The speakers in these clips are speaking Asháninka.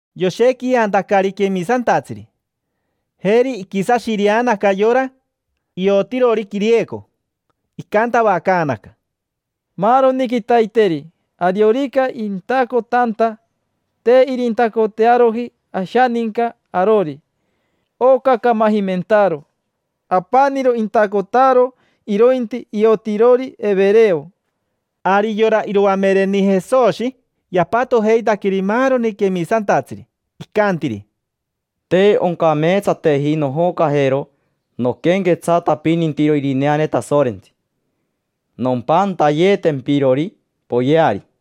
Yoshequiantacari quemisantatsiri, jeri iquisashireanaca yora iotirori quirieco. Icantavacaanaca: —Maaroni quitaiteri, ariorica intacotanta, te irintacotearoji ashaninca arori: oca camajimentaaro. Apaniro intacotaro irointi iotirori evereo. Ari yora iroamereni Jesoshi yapatojeitaqueri maaroni quemisantatsiri. Icantiri: —Te oncameetsateji nojocajero noquenquetsatapinitiro irineane Tasorentsi, nompantayetempirori poyeari.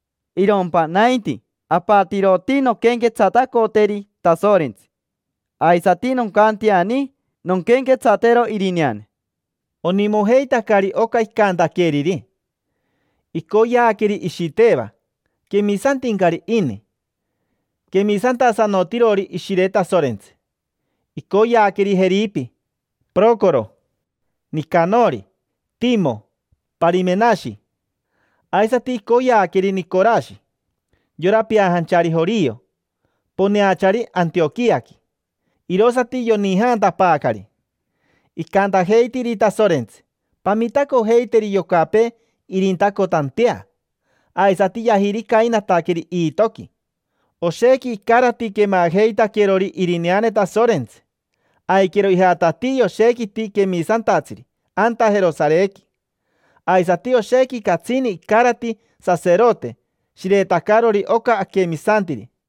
Irompa nainti, apatiroti nonquenquetsatacoteri Tasorentsi, aisati noncanteani nonquenquetsatero irineane. Onimojeitacari oca icantaqueriri. Icoyeaqueri Ishiteva: quemisantincari ini, quemisantasanotirori Ishire Tasorentsi. Icoyeaqueri Jeripi, Pirocoro, Nicanori, Timo, Parimenashi. Aisati icoyeaqueri Nicorashi, yora peajanchari jorio, poneachari Antioquiaqui. Irosati yonijaantapaacari. Icantajeitiri Tasorentsi: “Pamitacojeiteri yocapee irintacotantea”, aisati yajiricainataqueri iitoqui. Oshequi icarati quemajeitaquerori irineane Tasorentsi. Aiquero ijatatii yoshequiti quemisantatsiri anta Jerosarequi. Aisati oshequi catsini icarati saserote shiretacarori oca aquemisantiri.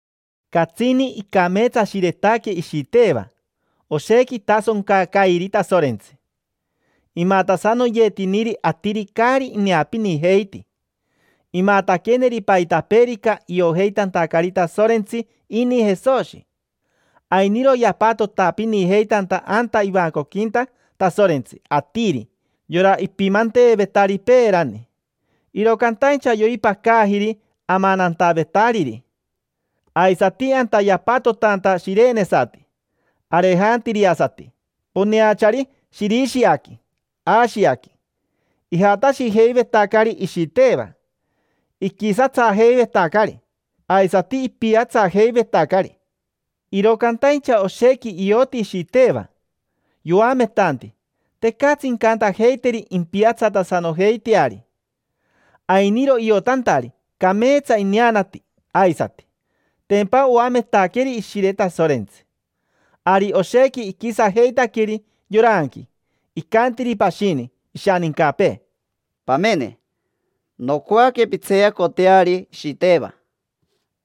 Catsini icameetsashiretaque Ishiteva. Oshequi itasoncacairi Tasorentsi. Imatasanoyetiniri atiri caari ineapinijeiti. Imataqueneri paitapeerica iojeitantacari Tasorentsi ini Jesoshi. Ainiro yapatotapinijeitanta anta ivancoquinta Tasorentsi atiri yora ipimanteevetari peerani, iro cantaincha yoipacajiri amanantavetariri. Aisati anta yapatotanta shirenesati, arejantiriasati, poneachari Shirishiaqui, Ashiaqui. Ijatashijeivetacari Ishiteva, iquisatsajeivetacari aisati ipiatsajeivetacari. Iro cantaincha oshequi ioti Ishiteva yoametanti, tecatsi incantajeiteri impiatsatasanojeiteari. Ainiro iotantari, cameetsa ineanati aisati, tempa oametaqueri Ishire Tasorentsi. Ari oshequi iquisajeitaqueri yoranqui, icantiri pashini ishanincapee: —Pamene, nocoaque pintseeyacoteari Ishiteva.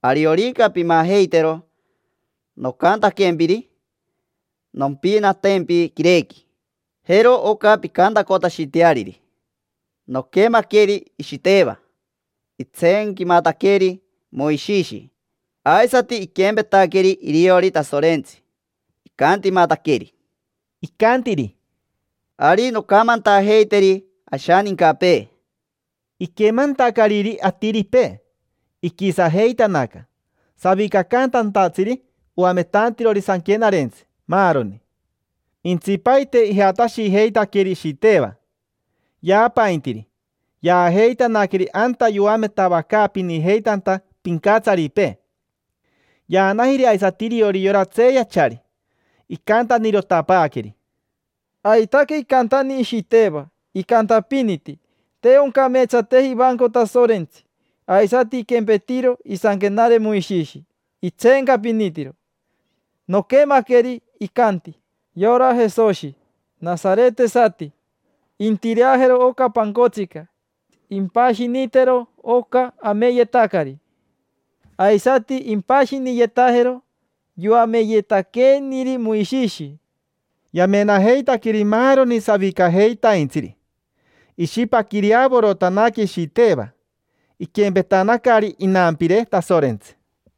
Ariorica pimajeitero nocantaquempiri, nompinatempi quirequi. Jero oca pincantacotashiteariri: “Noquemaqueri Ishiteva, itseenquimataqueri Moishishi. Aisati iquempetaqueri iriori Tasorentsi, icantimataqueri”. Icantiri: —Ari, noncamantajeiteri ashanincapee. Iquemantacariri atiripee, iquisajeitanaca: savicacantantatsiri, oametantirori sanquenarentsi, maaroni. Jentsipaite ijatashijeitaqueri Ishiteva, yaapaintiri, tapi; yaajeitanaqueri anta yoametavacaapinijeitanta pincatsaripee. Yaanajiri aisati iriori yora tseeyachari, icantanirotapaaqueri: —Aitaque icantani Ishiteva, icantapiniti: “Te oncameetsateji ivanco Tasorentsi”. Aisati iquempetiro isanquenare Moishishi, itseencapinitiro. Noquemaqueri, icanti: “Yora Jesoshi, nasaretesati, intireajero oca pancotsica. Impashinitero oca ameyetacari, aisati impashiniyetajero yoameyetaqueeniri Moishishi”. Yamenajeitaqueri maaroni savicajeitaintsiri, sorerere. Ishipaquireavorotanaque Ishiteva, iquempetanacari inampire Tasorentsi.